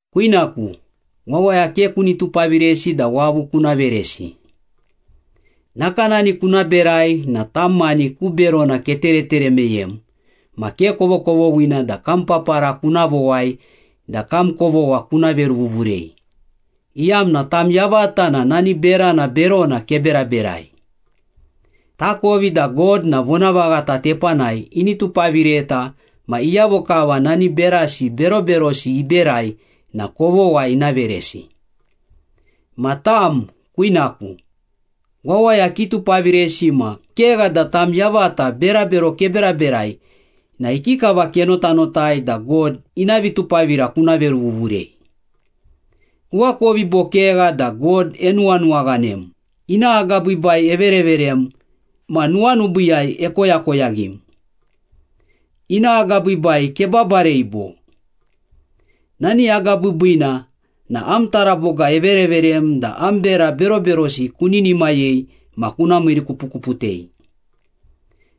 Kwinaku, wawaya ke kuni tupaviresi da wavu kuna veresi. Nakanani kuna berai na tam mani ku berona keteretere meyem ma ke kovokovoghina da kam papara kuna vowai da kam kovogha kuna veruvuvurei, iyamna tam yavata na nani berana berona keberaberai. Takovi da God na vonavaghata tepanai ini tupavireta ma iyavo kava nani berasi beroberosi iberai na kovogha ina veresi. Ma tam, kwinaku, wawaya kitupaviresi ma kegha da tam yavata berabero keberaberai na ikikava kenotanotai da God ina vitupavira kuna veruvuvurei? Kuakovi bo kegha da God enuwanuwaghanem, ina agabiibai evereverem ma nuwanubiiyai ekoyakoyaghim? Ina agabiibai kebabarei bo? Nani agabiibiina na am taraboga evereverem da am bera beroberosi kuninimayei ma kuna miirikupukuputei.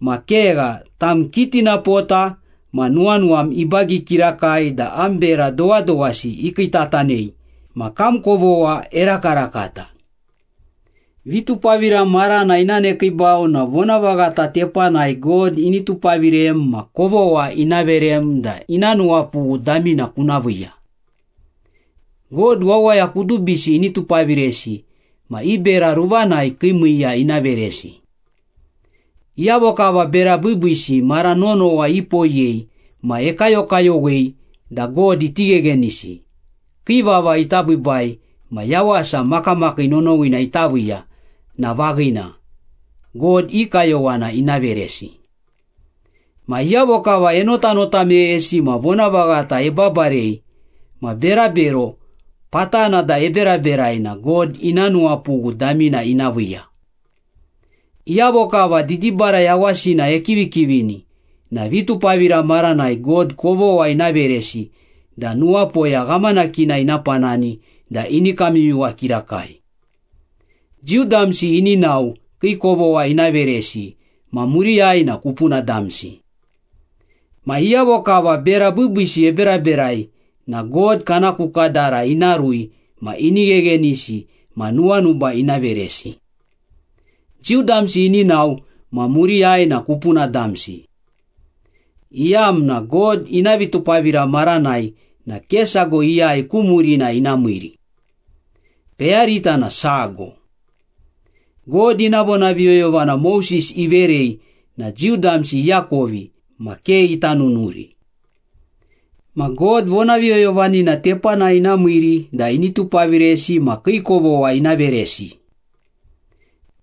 Ma kegha, tam kitinapota ma nuwanuwam ibagi kirakai da am bera dowadowasi ikiitatanei ma kam kovogha erakarakata. Vitupavira marana ina nekiibau na vonavaghata tepanai God ini tupavirem ma kovogha ina verem da ina nuwapughu damina kuna viiya. God wawaya kudubisi ini tupaviresi ma i bera ruvanai kii miiya ina veresi. Iyavo kava bera biibiisi mara nonowa ipoiyei ma ekayokayowei da God iti gheghenisi, kii vava ita biibai ma yawasa makamakii nonowina ita viiya na vaghina, God i kayowana ina veresi. Ma iyavo kava enotanota meyesi ma vonavaghata ebabarei ma berabero patana da eberaberai na God ina nuwapughu damina ina viiya. Iyavo kava didibara yawasina ekivikivini na vitupavira maranai God kovogha ina veresi da nuwapoya ghamanakina ina panani da ini kamyuyuwa kirakai. Jiu damsi ini nao kii kovogha ina veresi ma muriyai na kupuna damsi. Ma iyavo kava bera biibiisi eberaberai na God kana ku kadara ina rui ma ini gheghenisi ma nuwanuba ina veresi. Jiu damsi ini nao ma muriyai na kupuna damsi, iyamna God ina vitupavira maranai na ke sago iyai ku murina ina miiri. Peyarita na sago. God ina vonaviyoyovana Moses iverei na Jiu damsi iakovi ma ke ita nunuri. Ma God vonaviyoyovanina tepanai ina miiri da ini tupaviresi ma kii kovogha ina veresi.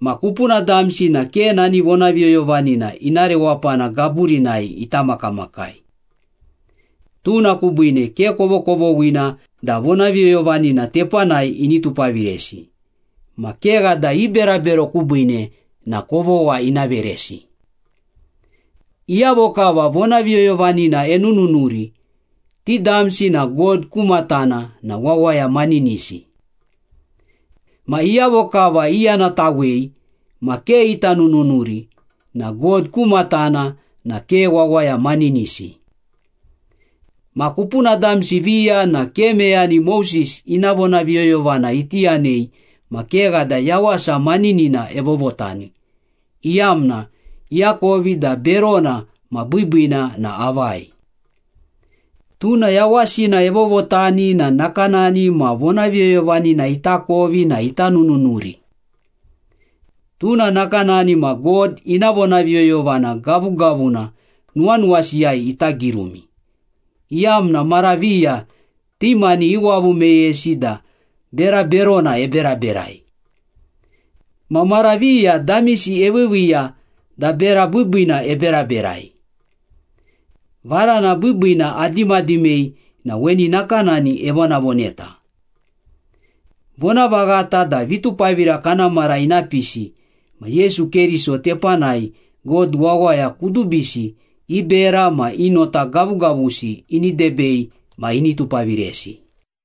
Ma kupuna damsi na ke nani vonaviyoyovanina ina rewapana gaburinai ita makamakai. Tuna kubiine ke kovokovoghina da vonaviyoyovanina tepanai ini tupaviresi, ma kegha da i berabero kubiine na kovogha ina veresi. Iyavo kava vonaviyoyovanina enununuri, ti damsi na God ku matana na wawaya maninisi. Ma iyavo kava iyanatawei ma ke ita nununuri na God ku matana na ke wawaya maninisi. Ma kupuna damsi viya na ke meyani Moses ina vonaviyoyovana iti yanei ma kegha da yawasa maninina evovotani, iyamna iakovi da berona ma biibiina na avai. Tuna yawasina evovotani na nakanani ma vonaviyoyovanina itakovi na ita nununuri. Tuna nakanani ma God ina vonaviyoyovana gavugavuna nuwanuwasiyai ita girumi, iyamna mara viya ti mani iwavu meyesi da bera berona eberaberai. Ma mara viya damisi eviiviiya da bera biibiina eberaberai. Varana biibiina adimadimei na weni nakanani evonavoneta. Vonavaghata da vitupavira kana mara ina pisi ma Yesu Keriso tepanai God wawaya kudubisi i bera ma i nota gavugavusi ini debei ma ini tupaviresi.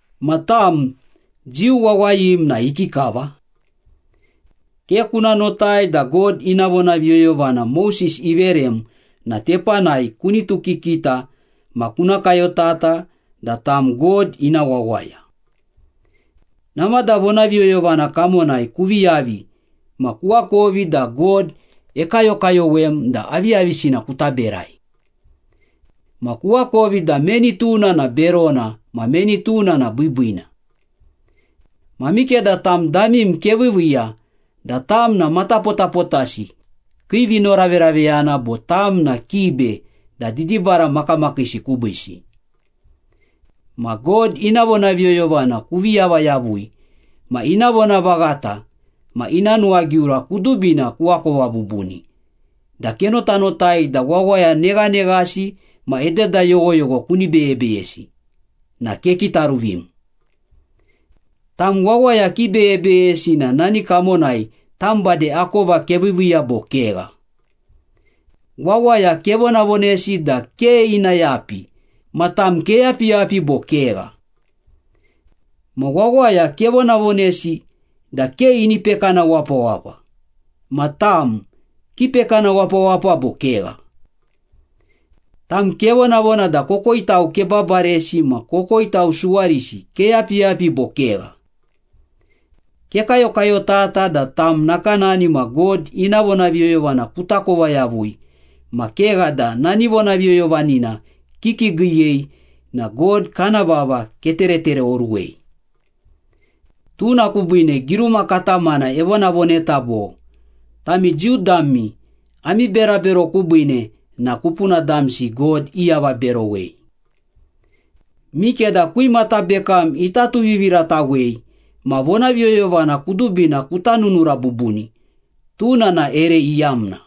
Ma tam, Jiu wawayim na ikikava? Ke kuna notai da God ina vonaviyoyovana Moses iverem na tepanai kunitukikita ma kuna kayotata da tam God ina wawaya. Namada vonaviyoyovana kamonai kuvi yavi ma kuakovi da God ekayokayowem da aviyavisina kuta berai. Ma kuakovi da meni tuna na berona ma meni tuna na biibiina. Ma mikeda tam damim keviiviiya da tam na matapotapotasi kii vinoraveraveyana bo tam na kibe da didibara makamakiisi kubiisi. Ma God ina vonaviyoyovana kuvi yava yavui ma ina vonavaghata ma ina nuwagiura kudubina kuakova bubuni da kenotanotai da wawaya neghaneghasi ma ededa yoghoyogho kuni beyebeyesi, na kekitaruvim. Tam wawaya kibeyebeyesi na nani kamonai tam bade akova keviiviiya bo kegha? Wawaya kevonavonesi da ke ina yapi ma tam keyapiyapi bo kegha? Ma wawaya kevonavonesi da ke ini pekana wapawapa ma tam, kipekana wapawapa bo kegha? Tam kevonavona da kokoitau kebabaresi ma kokoitau suwarisi keyapiyapi bo kegha? Kekayokayotata da tam nakanani ma God ina vonaviyoyovana kutakova yavui ma kegha da nani vonaviyoyovanina kikiigiiyei na God kana vava keteretereoruwei. Tuna kubiine giruma katamana evonavoneta bo, ‘Tami Jiu dami ami berabero kubiine na kupuna damsi God iavaberowei.’ Mikeda kwimata bekam ita tuviviratawei ma vonaviyoyovana kudubina kuta nunura bubuni, tuna na ere iyamna.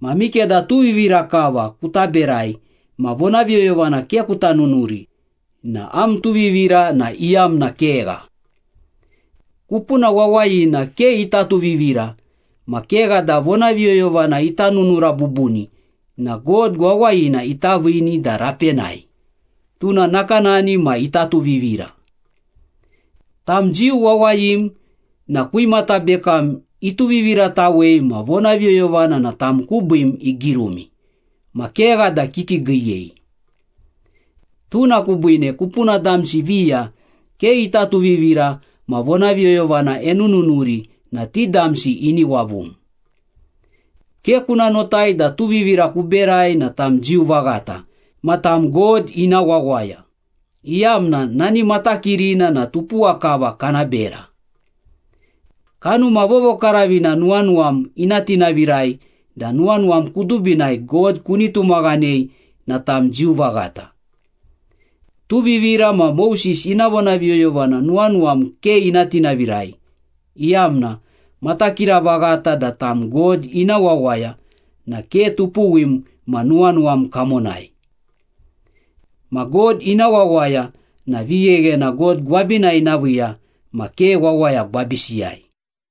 Ma mikeda tuvivira kava kuta berai ma vonaviyoyovana ke kuta nunuri na am tuvivira na iyamna kegha. Kupuna wawayina ke ita tuvivira ma kegha da vonaviyoyovana ita nunura bubuni na God wawayina ita viini da rapenai, tuna nakanani ma ita tuvivira. Tam Jiu wawayim na kwimata bekam ituviviratawei ma vonaviyoyovana na tam kubiim igirumi, ma kegha da kikiigiiyei. Tuna kubiine kupuna damsi viya ke ita tuvivira ma vonaviyoyovana enununuri na ti damsi ini wavum. Ke kuna notai da tuvivira kuberai na tam Jiu vaghata ma tam God ina wawaya, iyamna nani matakirina na tupuwa kava kana bera. Kanuma Vovokaravina nuwanuwam ina tinavirai da nuwanuwam kudubinai God kuni tumaghanei na tam Jiu vaghata. Tuvivira ma Moses ina vonaviyoyovana nuwanuwam ke ina tinavirai, iyamna matakira vaghata da tam God ina wawaya na ke tupuwim ma nuwanuwam kamonai. Ma God ina wawaya na vigheghena God gwabinai ina viiya ma ke wawaya gwabisiyai.